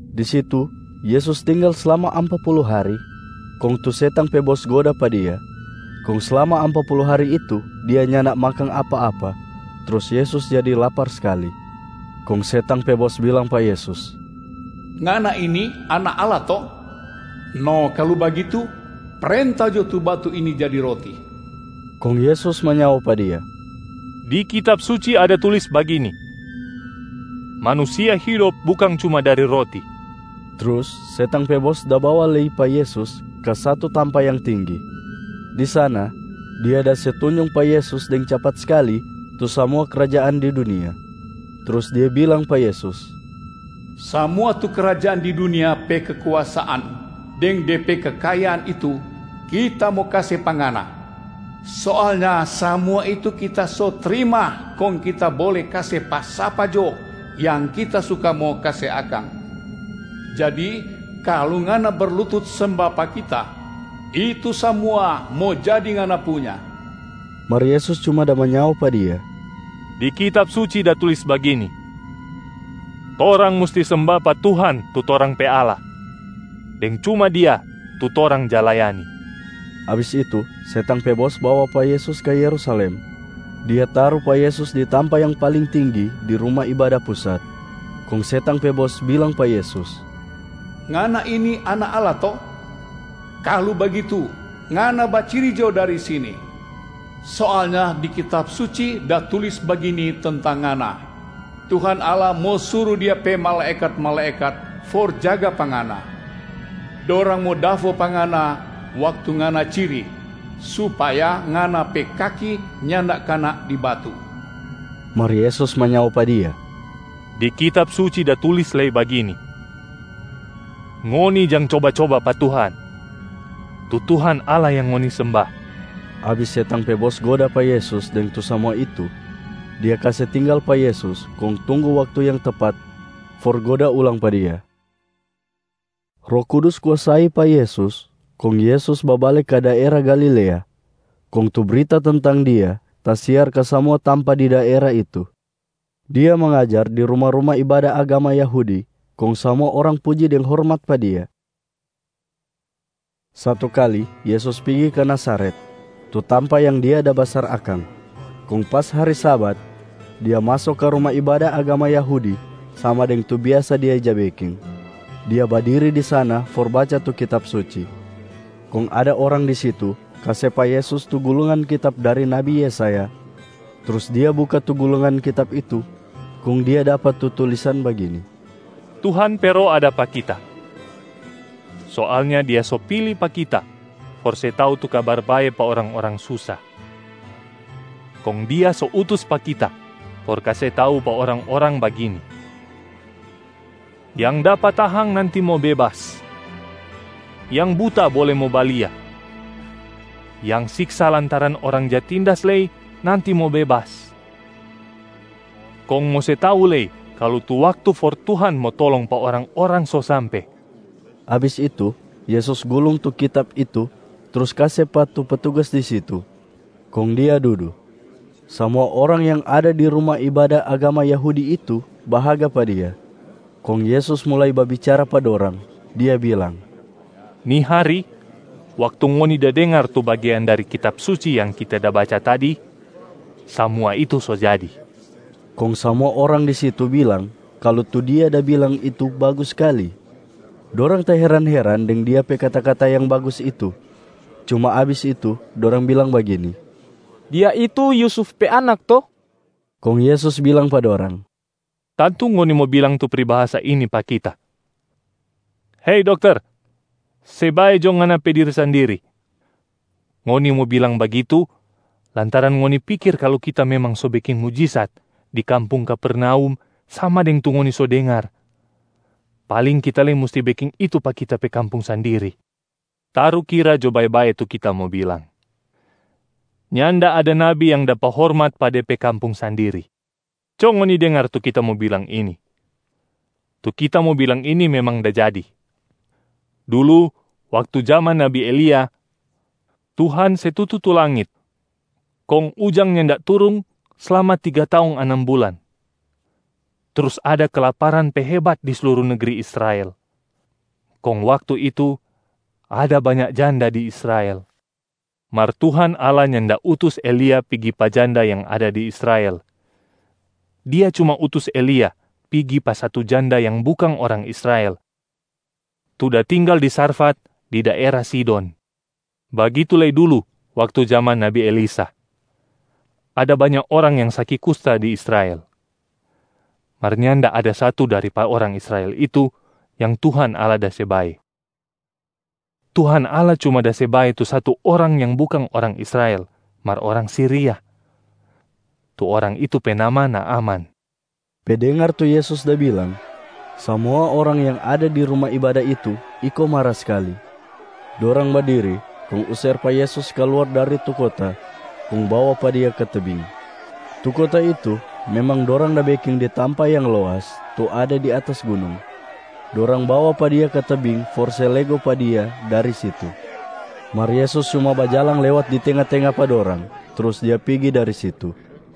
Di situ Yesus tinggal slama ampa pulu hari, kong tu setang pe bos goda pa Dia. Kong slama ampa pulu hari itu, Dia nyanda makang apa-apa trus Yesus jadi lapar skali. Kong setang pe bos bilang pa Yesus, “Ngana ini Anak Allah to? No kalu bagitu, prenta jo tu batu ini jadi roti.” Kong Yesus manyao pa dia, “Di Kitab Suci ada tulis bagini, ‘Manusia hidop bukang cuma dari roti.’” Trus setang pe bos da bawa lei pa Yesus ka satu tampa yang tinggi. Di sana, dia da se tunjung pa Yesus deng capat skali tu samua krajaan di dunia. Trus dia bilang pa Yesus, “Samua tu krajaan di dunia pe kekuasaan deng de pe kekayaan itu kita mo kase pa Ngana! Soalnya samua itu kita so trima kong kita bole kase pa sapa jo yang kita suka mo kase akang. Jadi kalu Ngana berlutut semba pa kita, itu samua mo jadi Ngana punya.” Mar Yesus cuma da manyao pa dia, “Di Kitab Suci da tulis bagini, ‘Torang musti semba pa Tuhan tu torang pe Allah, deng cuma Dia tu torang ja layani.’” Abis itu setang pe bos bawa pa Yesus ka Yerusalem, dia taru pa Yesus di tampa yang paling tinggi di Ruma Ibada Pusat. Kong setang pe bos bilang pa Yesus, “Ngana ini Anak Allah to? Kalu bagitu, Ngana baciri jo dari sini! Soalnya di Kitab Suci da tulis bagini tentang Ngana, ‘Tuhan Allah mo suru Dia pe malaekat-malaekat for jaga pa Ngana. Dorang mo dafo pa Ngana waktu Ngana ciri, supaya Ngana pe kaki nyanda kana di batu.’” Mar Yesus manyao pa dia, “Di Kitab Suci da tulis lei bagini, ‘Ngoni jang coba-coba pa Tuhan, tu Tuhan Allah yang ngoni semba.’” Abis setang pe bos goda pa Yesus deng tu samua itu, dia kase tinggal pa Yesus kong tunggu waktu yang tepat for goda ulang pa Dia. Roh Kudus kuasai pa Yesus kong Yesus babale ka daera Galilea. Kong tu brita tentang Dia tasiar ka samua tampa di daera itu. Dia mangajar di ruma-ruma ibada agama Yahudi kong samua orang puji deng hormat pa Dia. Satu kali Yesus pigi ka Nazaret, tu tampa yang Dia da basar akang. Kong pas hari Sabat, Dia maso ka ruma ibada agama Yahudi sama deng tu biasa Dia ja beking. Dia badiri di sana for baca tu Kitab Suci. Kong ada orang di situ kase pa Yesus tu gulungan kitab dari nabi Yesaya. Trus Dia buka tu gulungan kitab itu, kong Dia dapa tu tulisan bagini, “Tuhan pe Roh ada pa Kita. Soalnya Dia so pili pa Kita for se tau tu Kabar Bae pa orang-orang susa. Kong Dia so utus pa Kita for kase tau pa orang-orang bagini: yang dapa tahang nanti mo bebas, yang buta bole mo balia, yang siksa lantaran orang ja tindas lei nanti mo bebas, kong mo se tau lei kalu tu waktu for Tuhan mo tolong pa orang-orang so sampe.” Abis itu Yesus gulung tu Kitab itu trus kase pa tu petugas di situ, kong Dia dudu. Samua orang yang ada di ruma ibada agama Yahudi itu bahaga pa Dia. Kong Yesus mulai babicara pa dorang, Dia bilang, “Ni hari, waktu ngoni da dengar tu bagean dari Kitab Suci yang Kita da baca tadi, samua itu so jadi.” Kong samua orang di situ bilang kalu tu Dia da bilang itu bagus skali, dorang taheran-heran deng Dia pe kata-kata yang bagus itu. Cuma abis itu dorang bilang bagini, “Dia itu Yusuf pe anak to?” Kong Yesus bilang pa dorang, “Tantu ngoni mo bilang tu pribahasa ini pa Kita, ‘Hei dokter, se bae jo ngana pe diri sandiri.’ Ngoni mo bilang bagitu, lantaran ngoni pikir kalu Kita memang so beking mujisat di kampung Kapernaum sama deng tu ngoni so dengar, paling Kita lei musti beking itu pa Kita pe kampung sandiri. Tarukira jo bae-bae tu Kita mo bilang, nyanda ada nabi yang dapa hormat pa de pe kampung sandiri. Co ngoni dengar tu Kita mo bilang ini, tu Kita mo bilang ini memang da jadi: dulu waktu jaman nabi Elia, Tuhan se tutu tu langit kong ujang nyanda turung slama tiga taong anam bulan, trus ada kelaparan pe hebat di sluru negri Israel. Kong waktu itu, ada banya janda di Israel. Mar Tuhan Allah nyanda utus Elia pigi pa janda yang ada di Israel, Dia cuma utus Elia pigi pa satu janda yang bukang orang Israel tu da tinggal di Sarfat, di daera Sidon. Bagitu lei dulu waktu jaman nabi Elisa, ada banya orang yang saki kusta di Israel. Mar nyanda ada satu dari pa orang Israel itu yang Tuhan Allah da se bae, Tuhan Allah cuma da se bae tu satu orang yang bukang orang Israel mar orang Siria. Tu orang itu pe nama Naaman.” Pe dengar tu Yesus da bilang, samua orang yang ada di ruma ibada itu iko mara skali. Dorang badiri kong user pa Yesus kaluar dari tu kota kong bawa pa Dia ka tebing. Tu kota itu memang dorang da beking di tampa yang loas tu ada di atas gunung. Dorang bawa pa Dia ka tebing for se lego pa Dia dari situ. Mar Yesus cuma bajalang lewat di tenga-tenga pa dorang, trus Dia pigi dari situ.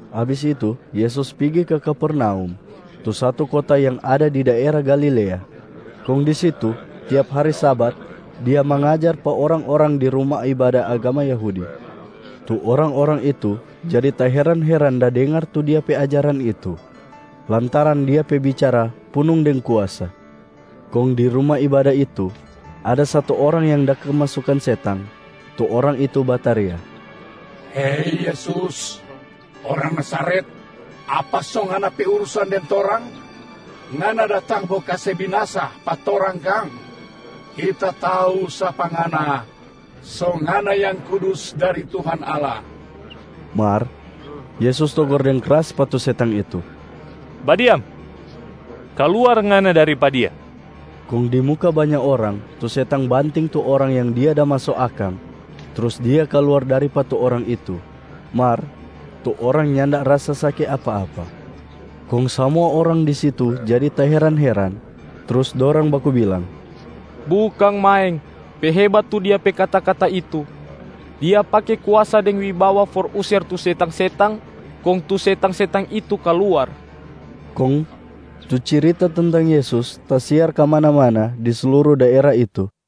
Abis itu Yesus pigi ka Kapernaum, tu satu kota yang ada di daera Galilea. Kong di situ tiap hari Sabat Dia mangajar pa orang-orang di ruma ibada agama Yahudi. Tu orang-orang itu jadi taheran-heran da dengar tu Dia pe ajaran itu, lantaran Dia pe bicara punung deng kuasa. Kong di ruma ibada itu, ada satu orang yang da kemasukan setang, tu orang itu bataria, “Hei Yesus orang Nazaret, apa so Ngana pe urusan deng torang? Ngana datang mo kase binasa pa torang kang? Kita tau sapa Ngana, so Ngana Yang Kudus dari Tuhan Allah.” Mar Yesus togor deng kras pa tu setang itu, “Badiam, kaluar ngana dari pa dia!” Kong di muka banya orang tu setang banting tu orang yang dia da maso akang, trus dia kaluar dari pa tu orang itu, mar tu orang nyanda rasa saki apa-apa. Kong samua orang di situ jadi taheran-heran, trus dorang baku bilang, “Bukang maeng pe hebat tu Dia pe kata-kata itu. Dia pake kuasa deng wibawa for user tu setang-setang kong tu setang-setang itu kaluar.” Kong tu cirita tentang Yesus tasiar kamana-mana di sluru daera itu.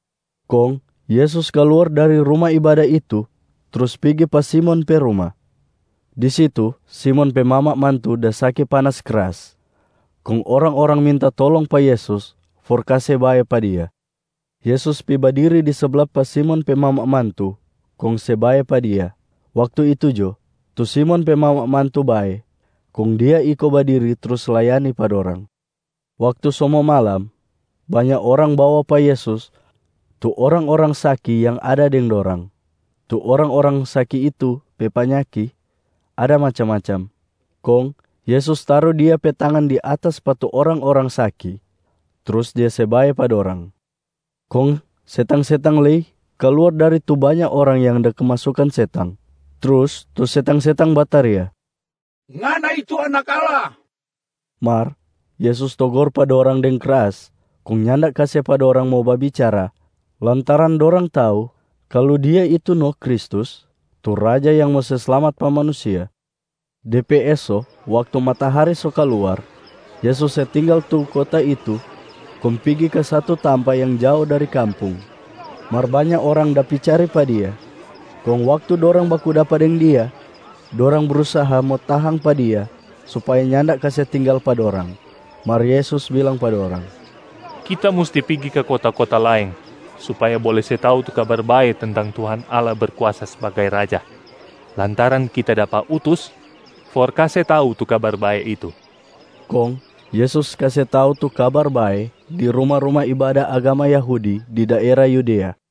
Kong Yesus kaluar dari ruma ibada itu trus pigi pa Simon pe ruma. Di situ Simon pe mama mantu da saki panas kras, kong orang-orang minta tolong pa Yesus for kase bae pa dia. Yesus pi badiri di sabla pa Simon pe mama mantu kong se bae pa dia. Waktu itu jo, tu Simon pe mama mantu bae, kong dia iko badiri trus layani pa dorang. Waktu so mo malam, banya orang bawa pa Yesus tu orang-orang saki yang ada deng dorang. Tu orang-orang saki itu pe panyaki ada macam-macam. Kong Yesus taru Dia pe tangan di atas pa tu orang-orang saki, trus Dia se bae pa dorang. Kong setang-setang lei kaluar dari tu banya orang yang da kemasukan setang. Trus tu setang-setang bataria, “Ngana itu Anak Allah.” Mar Yesus togor pa dorang deng kras kong nyanda kase pa dorang mo babicara lantaran dorang tau kalu Dia itu no Kristus tu Raja yang mo se slamat pa manusia. De pe eso waktu matahari so kaluar, Yesus se tinggal tu kota itu kong pigi ka satu tampa yang jao dari kampung. Mar banya orang da pi cari pa Dia. Kong waktu dorang baku dapa deng Dia, dorang brusaha mo tahang pa Dia supaya nyanda kase tinggal pa dorang. Mar Yesus bilang pa dorang, “Kita musti pigi ka kota-kota laeng supaya bole se tau tu Kabar Bae tentang Tuhan Allah Berkuasa sbagai Raja, lantaran kita dapa utus for kase tau tu Kabar Bae itu.” Kong Yesus kase tau tu Kabar Bae di ruma-ruma ibada agama Yahudi di daera Yudea.